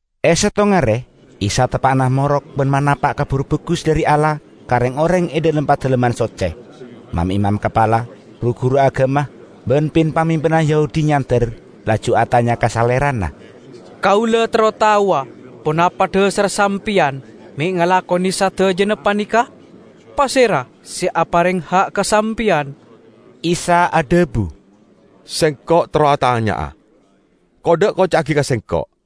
E settong are, Isa teppa'na morok ban manapa' Kabar Bagus dhari Allah ka reng-oreng e dhalem Padalemman Socce. Mam-imam kapala, ru-guru agama ban pin-pamimpin Yahudi nyander, laju atanya ka Salerana, "Kaula terro taowa ponapa dhasarra Sampeyan me' ngalakone sadajana paneka? Pasera se apareng ha' ka Sampeyan?" Isa adhabu, "Sengko' terro atanya'a. Kodda' koca'agi ka Sengko',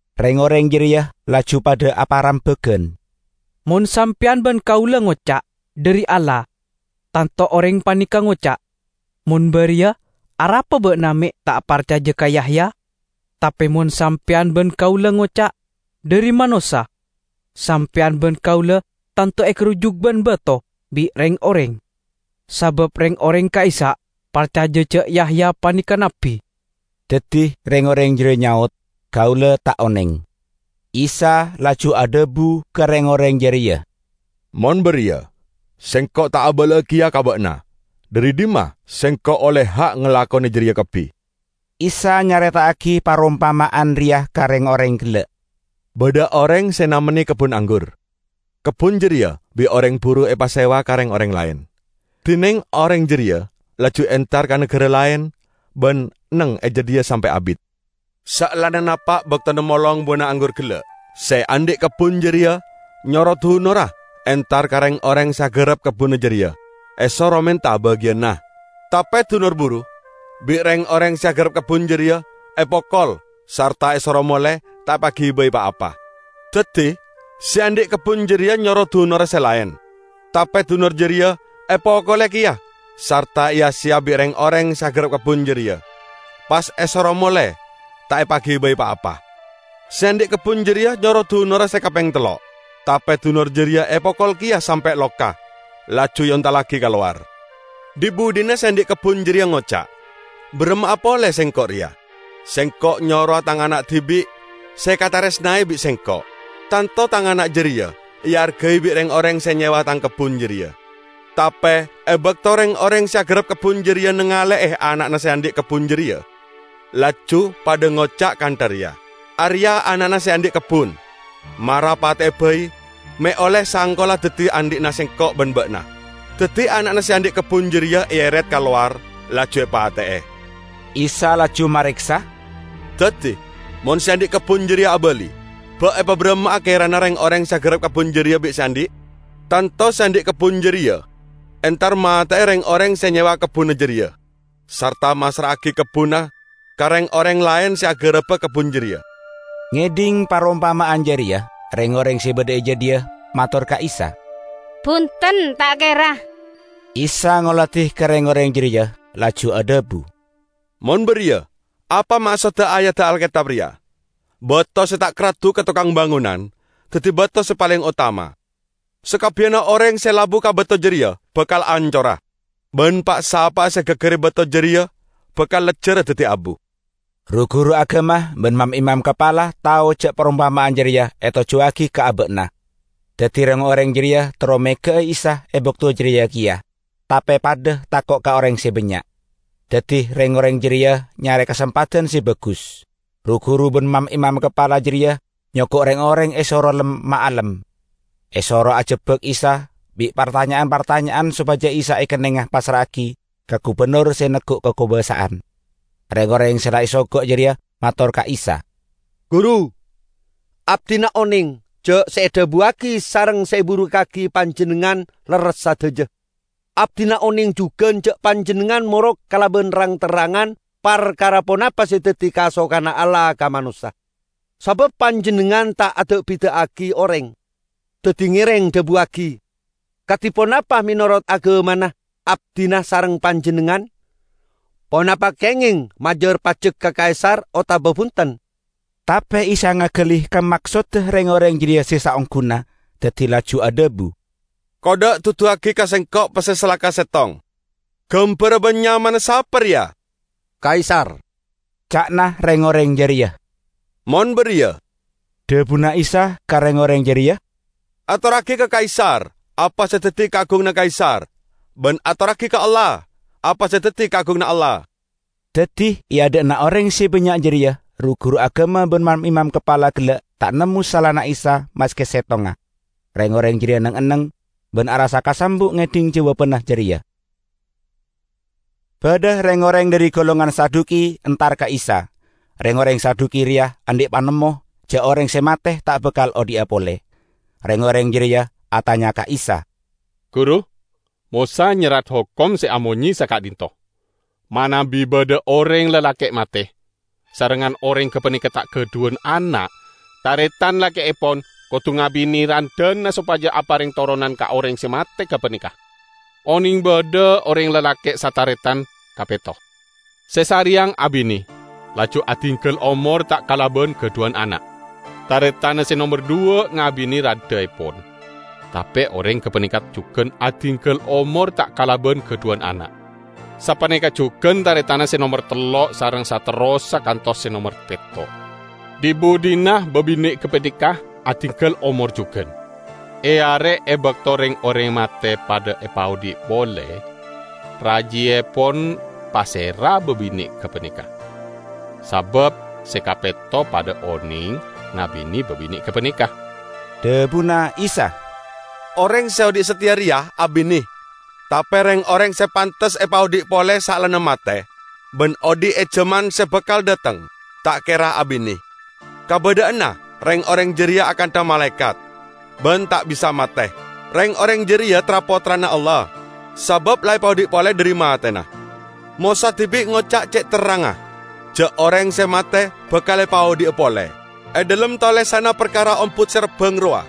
Reng-oreng jareya laju padha aparembagan, "Mon sampeyan ban kaula ngoca', 'Dhari Allah,' tanto oreng paneka ngoca', 'Mon bariya, arapa ba'na me' ta' parcaja ka Yahya?' Tape mon sampeyan ban kaula ngoca', 'Dhari manossa,' sampeyan ban kaula tanto egarujuk ban bato bi' reng-oreng, sabab reng-oreng ka'issa' parcaja ja' Yahya paneka nabbi." Daddi reng-oreng jareya nyaot, "Kaula ta' oneng." Isa laju adhabu ka reng-oreng jareya, "Mon bariya Sengko' ta' abala'a keya ka ba'na dhari dhimma Sengko' olle ha' ngalakone jareya kabbi." Isa nyareta'agi parompama'an reya ka reng-oreng gella', "Badha oreng se namenne kebbun anggur. Kebbun jareya bi' oreng buru epasewa ka reng-oreng laen, dineng oreng jareya laju entar ka nagara laen ban neng e jadhiya sampe' abit. Saellana napa' baktona molong buwana anggur gella', se andhi' kebbun jareya nyoro dunorra entar ka reng-oreng se agarap kebbunna jareya, esoro menta bagiyanna. Tape dunor buru bi' reng-oreng se agarap kebbun jareya epokol sarta esoro mole ta' epagibai pa-apa. Daddi se andhi' kebbun jareya nyoro dunorra se laen; tape dunor jareya epokole keya sarta eya-seya bi' reng-oreng se agarap kebbun jareya, pas esoro mole ta' epagibai pa-apa. Se andhi' kebbun jareya nyoro dunorra se kapeng tello'; tape dunor jareya epokol keya sampe' loka, laju eontallagi ka lowar. Dhi-budhina se andhi' kebbun jareya ngoca', 'Baramma'a pole sengko' reya? Sengko' nyorowa tang ana' dibi' se ekataresnae bi' sengko'. Tanto tang ana' jareya eargai bi' reng-oreng se nyewa tang kebbun jareya!' Tape e bakto reng-oreng se agarap kebbun jareya nangale'e ana'na se andhi' kebbun jareya, laju padha ngoca' kantha reya, 'Areya' ana'na se andhi' kebbun. Mara pate'e bai, me' olle sangkolla daddi andhi'na sengko' ban ba'na.' Daddi ana'na se andhi' kebbun jareya eeret ka lowar laju epate'e." Isa laju mareksa, "Daddi, mon se andhi' kebbun jareya abali, ba' epabaramma'a kerana reng-oreng se agarap kebbun jareya bi' se andhi'? Tanto se andhi' kebbun jareya entar mate'e reng-oreng se nyewa kebbunna jareya, sarta massra'agi kebbunna ka reng-oreng laen se agaraba kebbun jareya." Ngedhing parompama'an jareya, reng-oreng se badha e jadhiya mator ka Isa, "Bunten, ta' kera!" Isa ngoladi ka reng-oreng jareya, laju adhabu, "Mon bariya, apa maksodda ayadda Alketab reya? 'Bato se ta' karaddu ka tokang bangonan, daddi bato se paleng otama.' Sakabbiyanna oreng se labu ka bato jareya bakal ancora; ban pa'-sapa'a se egaggari bato jareya bakal lejjara daddi abu." Ru-guru agama ban mam-imam kapala tao ja' parompama'an jareya etojjuwagi ka aba'na. Daddi reng-oreng jareya terro mega'a Isa e bakto jareya keya, tape padha tako' ka oreng se bannya'. Daddi reng-oreng jareya nyare kasempadan se bagus. Ru-guru ban mam-imam kapala jareya nyogo' reng-oreng esoro lem-maalem, esoro ajebbak Isa bi' partanya'an-partanya'an sopaja Isa ekennenga passra'agi ka gubennor se neggu' kakobasa'an. Reng-oreng se la esogo' jareya mator ka Isa, "Guru, abdina oneng ja' se edhabuwagi sareng se eburukkagi Panjennengngan lerres sadaja. Abdina oneng jugan ja' Panjennengngan morok kalaban rang-terrangan parkara ponapa se daddi kasokanna Allah ka manossa, sabab Panjennengngan ta' ada'-bida'agi oreng. Daddi ngereng dhabuwagi, kadi ponapa menorot agamana abdina sareng Panjennengngan, ponapa kengeng majar pajek ka Kaisar otaba bunten?" Tape Isa ngagali ka maksodda reng-oreng jareya se saongguna, daddi laju adhabu, "Kodda' duduwagi ka Sengko' pesse salaka settong. Gambarra ban nyamana sapa reya?" "Kaisar!" ca'na reng-oreng jareya. "Mon bariya," dhabuna Isa ka reng-oreng jareya, "atorragi ka Kaisar apa se daddi kaagunganna Kaisar ban atorragi ka Allah apa se daddi kaagunganna Allah." Daddi e adha'na oreng se bannya' jareya ru-guru agama ban mam-imam kapala gella' ta' nemmo salana Isa maske settonga. Reng-oreng jareya neng-enneng, ban arassa kasambu' ngedhing jawabanna jareya. Badha reng-oreng dhari golongan Saduki entar ka Isa. (Reng-oreng Saduki reya andhi' panemmo ja' oreng se mate ta' bakal odhi'a pole.) Reng-oreng jareya atanya ka Isa, "Guru, Mosa nyerrat hokom se amonye saka'dhinto: Manabi badha oreng lalake' mate, sarengngan oreng gapaneka ta' gadhuwan ana', taretan lake'epon kodu ngabine randhana sopaja apareng toronan ka oreng se mate gapaneka. Oneng badha oreng lalake' sataretan kapetto. Se sareyang abine laju adinggal omor ta' kalaban gadhuwan ana'. Taretanna se nomer dhuwa' ngabine randhaepon, tape oreng gapaneka jugan adinggal omor ta' kalaban gadhuwan ana'. Sapaneka jugan taretanna se nomer tello' sareng saterrossa kantos ka se nomer petto'. Dhi-budhina babine' gapaneka adinggal omor jugan. E are e bakto reng-oreng mate padha epaodhi' pole, rajiepon pasera babine' gapaneka? Sabab se kapetto padha oneng ngabine babine' gapaneka." Dhabuna Isa, "Oreng se odhi' sateya reya abine, tape reng-oreng se pantes epaodhi' pole saellana mate, ban odhi' e jaman se bakal dhateng, ta' kera abine. Kabadha'anna reng-oreng jareya akantha malaekat, ban ta' bisa mate. Reng-oreng jareya tra-pottrana Allah, sabab la epaodhi' pole dhari matena. Mosa dibi' ngoca' ce' terrangnga ja' oreng se mate bakal epaodhi'a pole. E dhalem tolesanna parkara ombut se rabbang rowa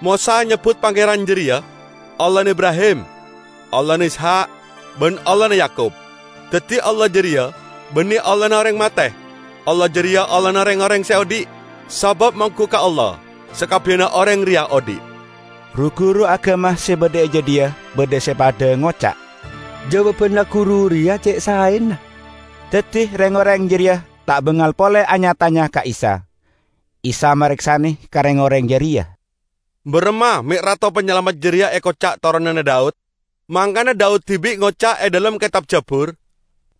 Mosa nyebbut Pangeran jareya 'Allahna Ibrahim, Allahna Ishak ban Allahna Yakub.' Daddi, Allah jareya banne Allahna oreng mate! Allah jareya Allahna reng-oreng se odhi'. Sabab monggu ka Allah sakabbiyanna oreng reya odhi'." Ru-guru agama se badha e jadhiya badha se padha ngoca', "Jawabanna Guru reya ce' saena." Daddi reng-oreng jareya ta' bangal pole anya-tanya ka Isa. Isa mareksane ka reng-oreng jareya, "Baramma me' Rato Panyalamet jareya ekoca' toronanna Daud? Mangkana Daud dibi' ngoca' e dhalem Ketab Jabur,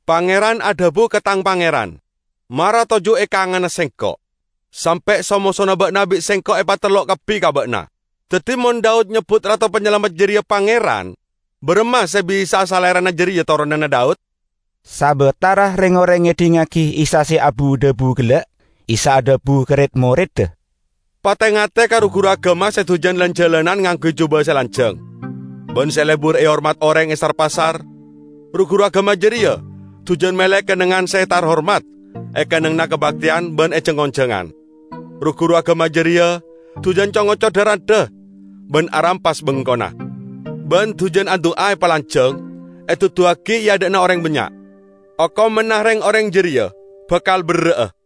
'Pangeran adhabu ka tang Pangeran: Mara toju' e kanganna Sengko', sampe' so-mosona ba'na bi' Sengko' epatellok kabbi ka ba'na.' Daddi mon Daud nyebbut Rato Panyalamet jareya 'Pangeran', baramma se bisa'a Salerana jareya toronanna Daud?" Sabatara reng-oreng ngedhingngagi Isa abu-dhabu gella', Isa adhabu ka red-moredda, "Pate-ngate ka ru-guru agama se dujan lan-jalanan ngangguy juba se lanjang, ban se lebur ehormat oreng e sar-pasar. Ru-guru agama jareya dujan mele kennengngan se tarhormat e kennengnganna kabakteyan ban e jang-onjangan. Ru-guru agama jareya dujan co-ngoco dha-randha ban arampas bengkona. Ban dujan adu'a epalanjang, eduduwagi e adha'na oreng bannya'! Okomanna reng-oreng jareya bakal berra'a!"